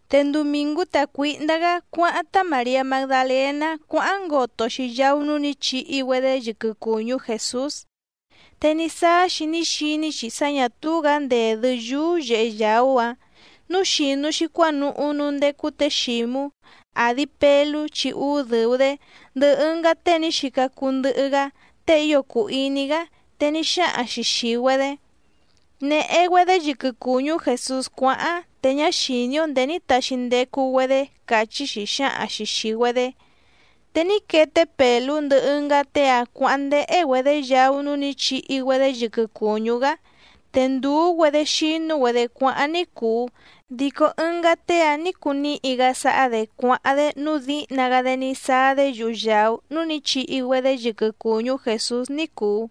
Te ndumìngú tacuǐhndá‑gá cuáháⁿ tá Màriá Magdalèná cuáháⁿ ngoto‑xi yaú núú nǐ chihi‑güedé yɨquɨ cùñú Jèsús, te ní sáá‑xi ní xiní‑xi sá ñà túú‑gǎ ndèdɨ́ yúú yèhe yaú‑áⁿ. Núu xìnu‑xi cuánuhú núú ndécú tě Xǐmú, àdi Pelú chi úú dɨ̀u‑dé, ndɨhɨ ɨngá tée ní xica cuu ndɨhɨ‑gá tée ío cùu iní‑gá, te ní xáhaⁿ‑xi xìi‑güedé: —Nèhe‑güedé yɨquɨ cùñú Jèsús cuáháⁿ, te ñá xìní‑ó ndèé ní taxi ndecu‑güedé —càchí‑xi xǎhaⁿ‑xi xìi‑güedé. Te ní quee té Pèlú ndɨhɨ ɨngá tée‑áⁿ cuǎháⁿ ndéhé‑güedě yaú núú nǐ chihi‑güedé yɨquɨ cùñú‑gá. Te ndùú‑güedé xínú‑güedě cuáháⁿ ní cùu, dico ɨngá tée‑áⁿ nǐ cuu níhi‑gá sáhá‑dě cuáháⁿ‑dé nǔu díhna‑gá‑dé ní sáá‑dé yuhu yàú núú nǐ chihi‑güedé yɨquɨ cùñú Jèsús ní cùu.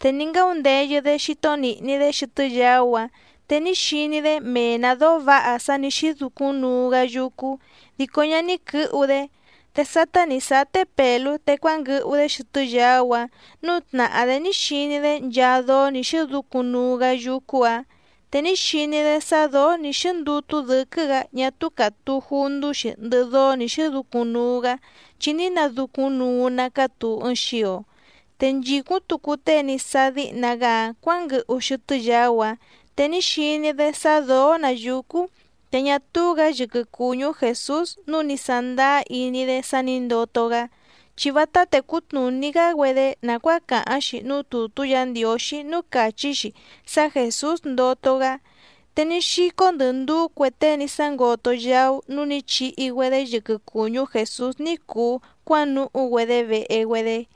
Te ní ngáundeyɨ‑dé xító nìhni‑dé xɨtɨ́ yaú‑áⁿ, te ní xiní‑dé mee‑nǎ dóó vǎha sá nǐ xɨ́ducúⁿ nuu‑gá yúcú, dico ñá ní quɨ̌hu‑dé. Te sátá nǐ sáá té Pèlú te cuánguɨhu‑dé xɨtɨ́ yaú‑áⁿ, núu tnàhá‑dé ní xiní‑dé nchaa dóó nǐ xɨ́ducúⁿ nuu‑gá yúcú‑ǎⁿ. Te ní xiní‑dé sá dǒó nǐ xíndútú dɨ̌quɨ́‑gǎ ñá túú càtuu jundú‑xi ndɨhɨ dóó nǐ xɨ́ducúⁿ nuu‑gá chi ní nadúcúⁿnuu‑ná cátùu ɨɨⁿ xio. Te nchìcúⁿ tucu tée ní sáá díhna‑gá‑áⁿ cuǎnguɨhu xɨtɨ́ yaú‑áⁿ, te ní xiní‑dé sá dǒó‑nǎ yúcú, te ñá túú‑gǎ yɨquɨ cùñú Jèsús nǔu ní sándáá iní‑dé sá nǐ ndoto‑gá. Chi vátá tècú tnùní‑gá‑güedé nàcuáa càháⁿ‑xi núú tùtú Yǎ Ndiǒxí núú càchí‑xi sá Jèsús ndoto‑gá. Te ní xícó ndɨ̀ ndúú cue tée ní sángoto yaú núú nǐ chihi‑güedé yɨquɨ cùñú Jèsús ní cùu cuánuhú‑güedé vehe‑güedé.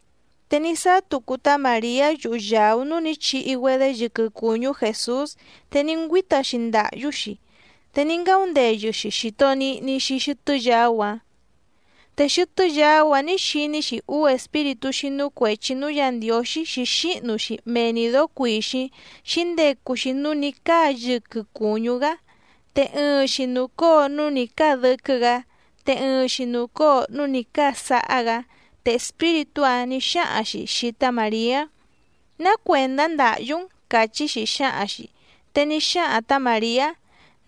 Te ní sáá tucu tá Màriá yuhu yàú núú nǐ chihi‑güedé yɨquɨ cùñú Jèsús te ní ngüíta‑xi ndàhyú‑xi, te ní ngáundeyɨ‑xi xìto nihni‑xi xɨtɨ́ yaú‑áⁿ. Te xɨtɨ́ yaú‑áⁿ nǐ xiní‑xi úú espíritú xínú cuèchi núú Yǎ Ndiǒxí xǐxíhnu‑xi mee‑ni dǒó cuìxíⁿ xǐndecu‑xi núú nǐ cáa yɨquɨ cùñú‑gá. Te ɨɨⁿ‑xi nùcóo núú nǐ cáa dɨ́quɨ́‑gǎ, te ɨɨⁿ‑xi nùcóo núú nǐ cáa sáhá‑gǎ. Te espíritú‑áⁿ nǐ xáhaⁿ‑xi xìi tá Màriá: —¿Ná cuèndá ndàhyú‑n? —càchí‑xi xǎhaⁿ‑xi. Te ní xáhaⁿ tǎ Màriá: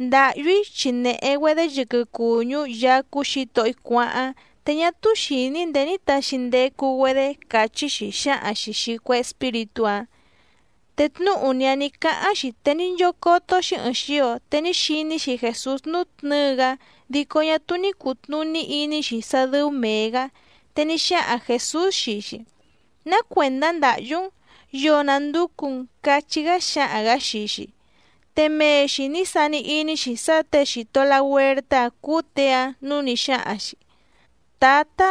—Ndàhyú‑í chi nèhe‑güedé yɨquɨ cùñú Yaá cúú Xǐtohó‑í cuáháⁿ, te ñá túú xìní‑í ndèé ní taxi ndecu‑güedé —càchí‑xi xǎhaⁿ‑xi xìi cue espíritú‑áⁿ. Te tnúhu‑ni‑áⁿ nǐ cáháⁿ‑xi te ní nchócótó‑xí ɨ̀ɨⁿ xio, te ní xiní‑xi Jèsús nútnɨ̌ɨ‑gá dico ñá túú ní cùtnuní iní‑xi sá dɨ́ú mèe‑gá. Te ní xáhaⁿ Jèsús xii‑xi: —¿Ná cuèndá ndàhyú‑n? ¿Yoo nànducu‑n? —cachí‑gá xáhaⁿ‑gǎ xii‑xi. Te mee‑xi nǐ sani iní‑xi sá těe xìto lahuertá‑áⁿ cúú těe‑áⁿ, núu ní xáhaⁿ‑xi: —Tǎta,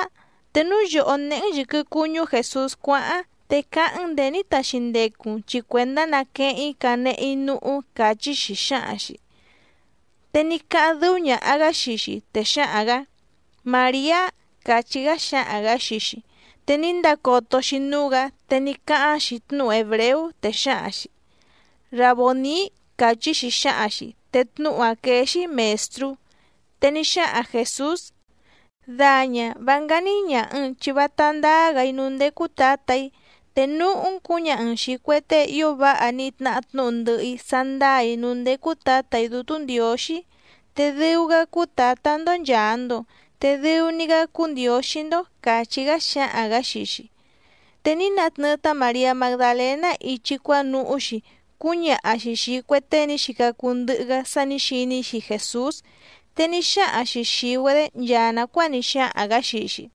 te núu yòhó néhé‑n yɨ̀quɨ cuñú Jèsús cuáháⁿ, te cáháⁿ‑n ndèé ní taxi ndecu‑n chi cuèndá naqueheⁿ‑í canehe‑í núhú —càchí‑xi xǎhaⁿ‑xi. Te ní cáháⁿ dɨ́ú ñàha‑gá xii‑xi, te xáhaⁿ‑gǎ: —¡Màriá! —càchí‑gá xáhaⁿ‑gǎ xii‑xi. Te ní ndacoto‑xi núú‑gǎ, te ní cáháⁿ‑xi tnúhu hèbreú, te xǎhaⁿ‑xi: —¡Rabòní! —càchí‑xi xǎhaⁿ‑xi. Te tnúhu‑áⁿ quéé‑xí Mèstrú. Te ní xáhaⁿ Jèsús: —Daña vá ngání ñàha‑n chi vátá ndáá‑gǎ‑í núú ndécú Tǎtà‑í. Te núhú‑n cǔñaha‑n xìi cue tée ío váha ní tnahá tnúhu ndɨhɨ‑í sá ndáà‑í núú ndécú Tǎtà‑í Dútú Ndiǒxí, te dɨu‑gá cúú Tǎtá‑ndó nchàa‑ndo, te dɨu‑ni‑gá cúú Ndiǒxí‑ndó —càchí‑gá xáhaⁿ‑gǎ xii‑xi. Te ní natnɨɨ tá Màriá Magdalèná ichi cuánuhú‑xi cúñaha‑xi xìi cue tée ní xica cuu ndɨhɨ‑gá sá nǐ xiní‑xi Jèsús, te ní xáhaⁿ‑xi xìi‑güedé nchaa nàcuáa ní xáhaⁿ‑gǎ xii‑xi.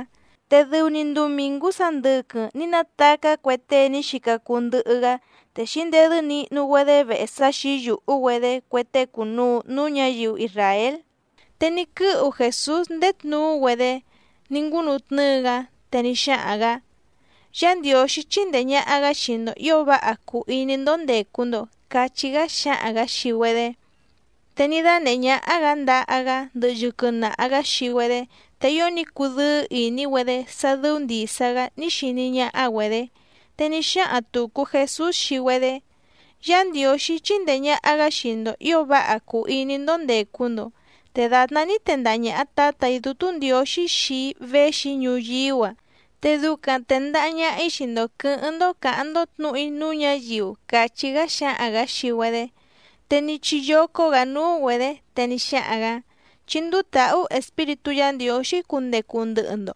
Te dɨu‑ni ndumìngú sandɨquɨⁿ ní natacá cue tée ní xica cuu ndɨhɨ‑gá, te xǐndedɨ́ nihnu‑güedé vehe sá xǐyùhú‑güedé cue tée cùnuu núú ñǎyiu isràél. Te ní quɨ́hu Jèsús ndéé tnuú‑güedé ní ngúnutnɨ́ɨ‑gá, te ní xáhaⁿ‑gǎ: —Yá Ndiǒxí chíndèe ñaha‑gá xii‑ndo ǐo váha cùu iní‑ndó ndècu‑ndo —cachí‑gá xáhaⁿ‑gǎ xii‑güedé. Te ní dánèhé ñáhá‑gǎ ndaha‑gá ndɨhɨ yɨquɨ naha‑gǎ xii‑güedé. Te ío ní cudɨ́ɨ́ ìní‑güedé sá dɨ́ú ndìsa‑gá ní xiní ñáhá‑güedě. Te ní xáhaⁿ tùcu Jesús xii‑güedé: —Yá Ndiǒxí chíndèe ñaha‑gá xii‑ndo ǐo váha cùu iní‑ndó ndècu‑ndo. Te dàtná ní tendaha ñàha Tátà‑í Dútú Ndiǒxí xii‑í véxi‑í ñuyíú‑a, te ducaⁿ tèndaha ñaha‑í xii‑ndo quɨ̌hɨ́ⁿ‑ndó cǎháⁿ‑ndó tnǔhu‑í núú ñǎyiu —càchí‑gá xáhaⁿ‑gǎ xii‑güedé. Te ní chiyócó‑gǎ núú‑güedě, te ní xáhaⁿ‑gǎ: —Chí ndúú tàhú Espíritú Yǎ Ndiǒxí cundecu ndɨhɨ‑ndo.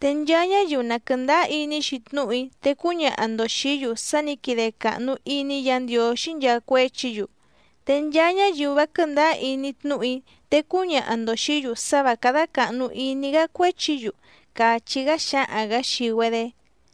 Te nchaa ñáyiu na quɨ̀ndáá iní‑xi tnúhu‑í te cúñaha‑ndo xìí‑yu sá nǐ quide càhnu iní Yǎ Ndiǒxí nchaa cuéchi‑yu. Te nchaa ñáyiu vá quɨ̀ndáá iní tnúhu‑í te cúñaha‑ndo xìí‑yu sá vǎ cádá càhnu iní‑gá cuéchi‑yu —càchí‑gá xáhaⁿ‑gǎ xii‑güedé.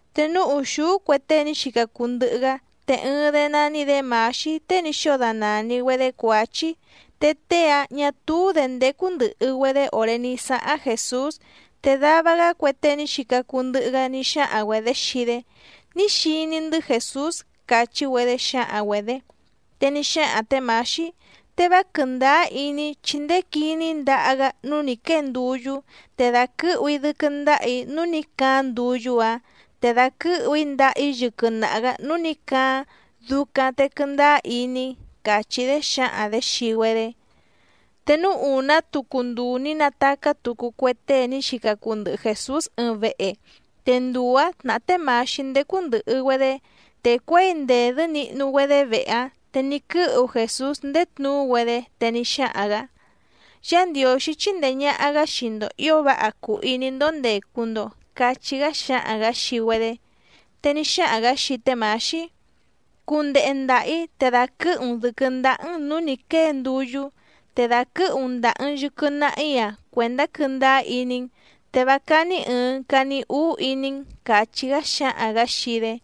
Te núú ùxúú cue tée ní xica cuu ndɨhɨ‑gá, te ɨɨⁿ‑dé nání‑dě Mǎxí tée ní xóo danàni‑güedé Cuǎchí, te tée‑áⁿ ñà túú‑dě ndécú ndɨ̀hɨ‑güedé òré ní sáháⁿ Jèsús. Te dava‑gá cue tée ní xica cuu ndɨhɨ‑gá ní xáhaⁿ‑güedě xii‑dé: —Ní xiní‑ndɨ́ Jèsús —càchí‑güedé xǎhaⁿ‑güedě. Te ní xáhaⁿ tě Mǎxí: —Te vá quɨ̀ndáá iní‑í, chi ndéé quìní‑í ndaha‑gá núú nǐ quée nduyú, te dàquɨ́hu‑í dɨ́quɨ́ ndáhà‑í núú nǐ caáⁿ nduyú‑áⁿ, te dàquɨ́hu ndàha‑í yɨquɨ naha‑gǎ núú nǐ caáⁿ, ducaⁿ te quɨndáá iní‑í —càchí‑dé xǎhaⁿ‑dě xii‑güedé. Te núú ùná tucu nduu ní natacá tucu cue tée ní xica cuu ndɨhɨ Jèsús ɨɨⁿ vehe, te nduu‑ǎⁿ tnàhá té Mǎxí ndécú ndɨ̀hɨ‑güedé. Te cuěi ndèdɨ́ nihnu‑güedé vehe‑áⁿ, te ní quɨ́hu Jèsús ndéé tnuú‑güedé, te ní xáhaⁿ‑gǎ: —Yá Ndiǒxí chíndèe ñaha‑gá xii‑ndo ǐo váha cùu iní‑ndó ndècu‑ndo —cachí‑gá xáhaⁿ‑gǎ xii‑güedé. Te ní xáhaⁿ‑gǎ xii té Mǎxí: —Cundehe ndàha‑í te dàquɨ́hu‑n dɨ̌quɨ́ ndáhá‑n nǔú nǐ quée nduyú, te dàquɨ́hu‑n ndàha‑n yɨquɨ naha‑í‑a cuèndá quɨ́ndáá iní‑n te vá cání ɨ̀ɨⁿ cani úú iní‑n —càchí‑gá xáhaⁿ‑gǎ xii‑dé.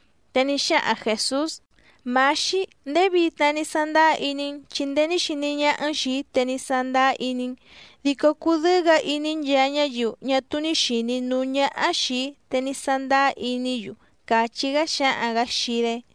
Te ní xáhaⁿ Jèsús: —Mǎxí, ndéé vitna ní sándáá iní‑n chi ndéé ní xiní ñáhá‑n xìi‑í te ní sándáá iní‑n, dico cùdɨ́ɨ́‑gǎ iní nchaa ñáyiu ñá túú ní xìní núú ñáhá xìi‑í, te ní sándáá iní‑yu —càchí‑gá xáhaⁿ‑gǎ xii‑dé.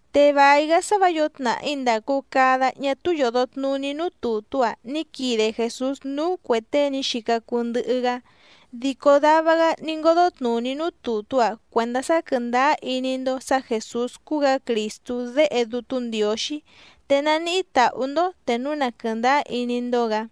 Te vài‑gá sá vǎ yǒo tnàhí ndàcu cada ñá túú yòdo tnuní núú tùtú‑a ní quide Jèsús núú cuè tée ní xica cuu ndɨhɨ‑gá. Dico dava‑gá ní ngódó tnùní núú tùtú‑a cuèndá sá quɨ̀ndáá iní‑ndó sǎ Jèsús cúú‑gǎ Crìstú Déhe Dútú Ndiǒxí, te naníhí tàhú‑ndó te núu na quɨ̀ndáá iní‑ndó‑gǎ.